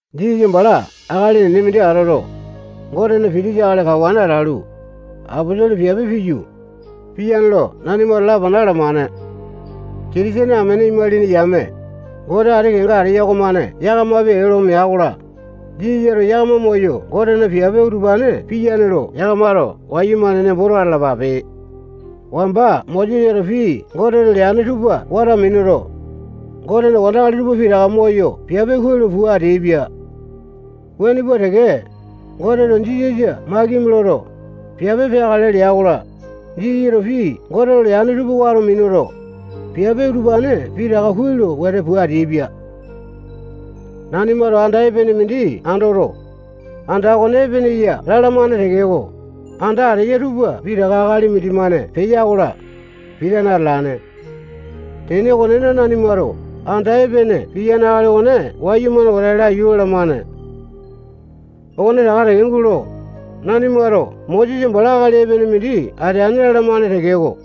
Jisasa bala akali enene mindi atoto, Gotena pitisa akali kawane atalu, aposolo piape piyu, piyane lo nanimato lapana alamane. Kitisene amene imalini yame, Gote ati kenga ateya okomane yakamapi ee lo mea-kola, Jisasato yakama moyo Gotena piape utupane piyane lo yakamato wayumane nemboto atalapape. Wamba Mosesato pii Goteto Goteto leane tupa wato minuto, Gotena wandakali tupa pitaka moyo piape kuai lo pua ateaipia. Wuane pua teke, Goteto Jisasa makimi loto, piape peakale lea-kola, Jisasato pii Goteto leane tupa wato minuto, piape utupane pitaka kuai lo wete pua ateaipia. Nanimato anda epene mindi andoto, anda okone epene ya lalamane tekeko, anda ateya tupa pitaka akali mindimane peya-kola, pitane atalane. Tene okonena, nanimato anda epene piyane akali okone wayumane wete laiyu lalamane. Okone taka gulo, nanimato Mosesa bala akali epene mindi ateane lalamane tekeko,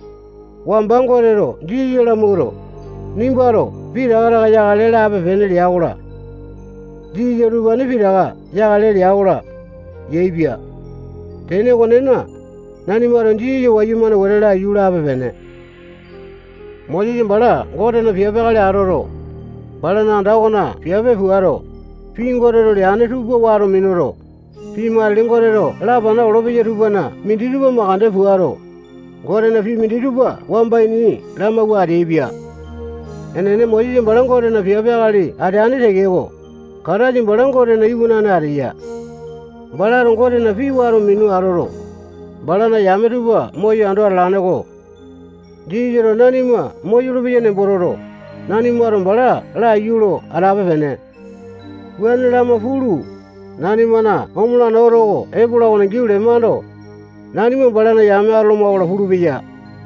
wamba Goteto Jisasa lamawuato, nimbato pitaka taka yakale lape lea-kola, Jisasato utupane pitaka yakale lea-kola, yaepia. Tene okonena, nanimato Jisasa wayumane wete laiyu lape-pene. Mosesa bala Gotena piape akali atoto, balana anda okona piape puato, pii Goteto leane tupa wato minuto, pii matili Goteto lapanawa olopeya tupana minditupa mandeke puato, Gotena pii minditupa wamba ini lamawua ateaipia. Enene, Mosesa bala Gotena piape akali ateane tekeko, Kataisa bala Gotena iwanane ateya. Balato Gotena pii wato minu atoto, balana yame tupa moyo ando atalane-ko. Jisasato nanima moyolo-peya nembo toto, nanimato bala laiyu lo atape-pene. Wuane lama pulu, nanimana omolane oto oko epola okona giau lemando, nanima balana yame atoloma-kola pulupeya.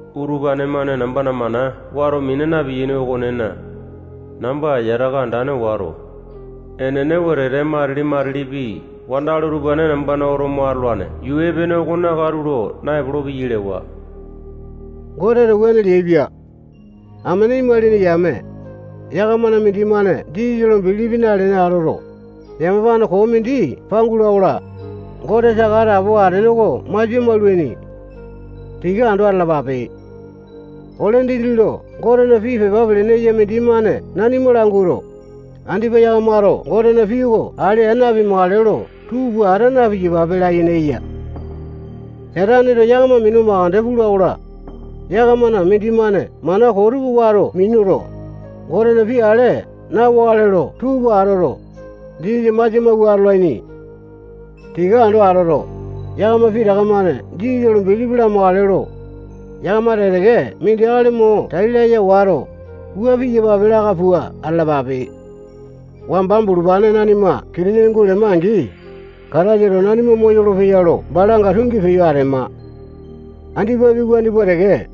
Utupane-mane nambana mana wato mina piyaini okonena, namba yataka andane wato, enene wetete matili-matilipi wandakali utupane nambana oto mo atolane yuu epene okona katulo naepolo-peyai lewa. Goteto wuane leaipia. Amene imalini yame, yakamana mindimane Jisasa lo bilipi nalene atoto, yamapane koo mindi pangula-kola, Gote saka atapowa atene oko masia maulaini. Tika ando atalapape. Ole dindi lo Gotena pii pepa pelene eya mindimane nanima languato, andipa yakamato Gotena pii oko ale aa napimakale lo tuu pua ata na-piyapape layene eya. Sataneto yakama minu makande pula-kola, yakamana mindimane mana koo tupa wato minuto, Gotena pii ale na-wakale lo tuu pua atoto, Jisasa masia mawua atolaini. Tika ando atoto, yakama pitaka-mane Jisasa lo bilipi lamakale lo, yakama teke-teke mindi akali mo tai laya wato, wua piyapape laka pua atalapape. Wamba bulupane nanima Kitisene gulema-angi, Kataisato nanima moyolo-peya lo balanga tungi peyo atema. Andipapi wuane pua teke,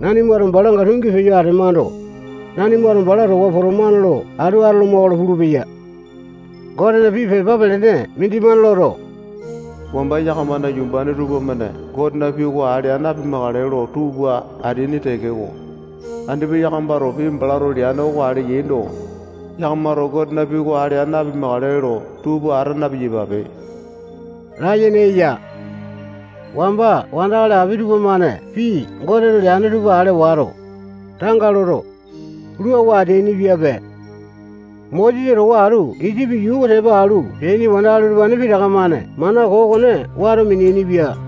nanimato balanga tungi peyo atemando, nanimato bala towa potomane lo atu atoloma-kola pulupeya. Gotena pii pepa pelene mindimane loto, wamba yakamana yumbane tupamane Gotena pii oko ale aa napimakale lo tuu pua ateaini tekeko, andipa yakamato pii balato leane oko ale yaindo, yakamato Gotena pii oko ale aa napimakale lo tuu pua ata na-piyapape layene eya. Wamba wandakali api tupamane pii Goteto leane tupa ale wato, tanga loto, luawa ateainipiape. Mosesa towa atu Isipi yuu oko tepa alu peaini wandakali utupane pitaka-mane mana koo okone wato meainipia.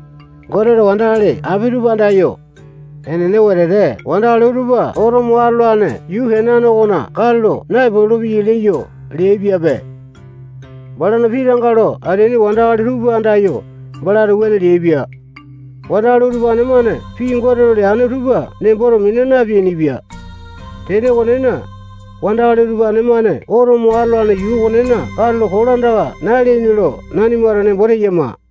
Goteto wandakali api tupa andayo, enene wetete wandakali utupa oto mo atolane yuu Kenane okona katulo naepolo-peyai leyo leaipiape. Balana pii tanga lo ateaini wandakali tupa andayo, balato wuane leaipia. Wandakali utupane-mane pii Goteto leane tupa nemboto mina napeainipia. Tene okonena, wandakali utupane-mane oto mo atolane yuu okonena katulo kolandaka naleaini lo nanimato nembo teyama.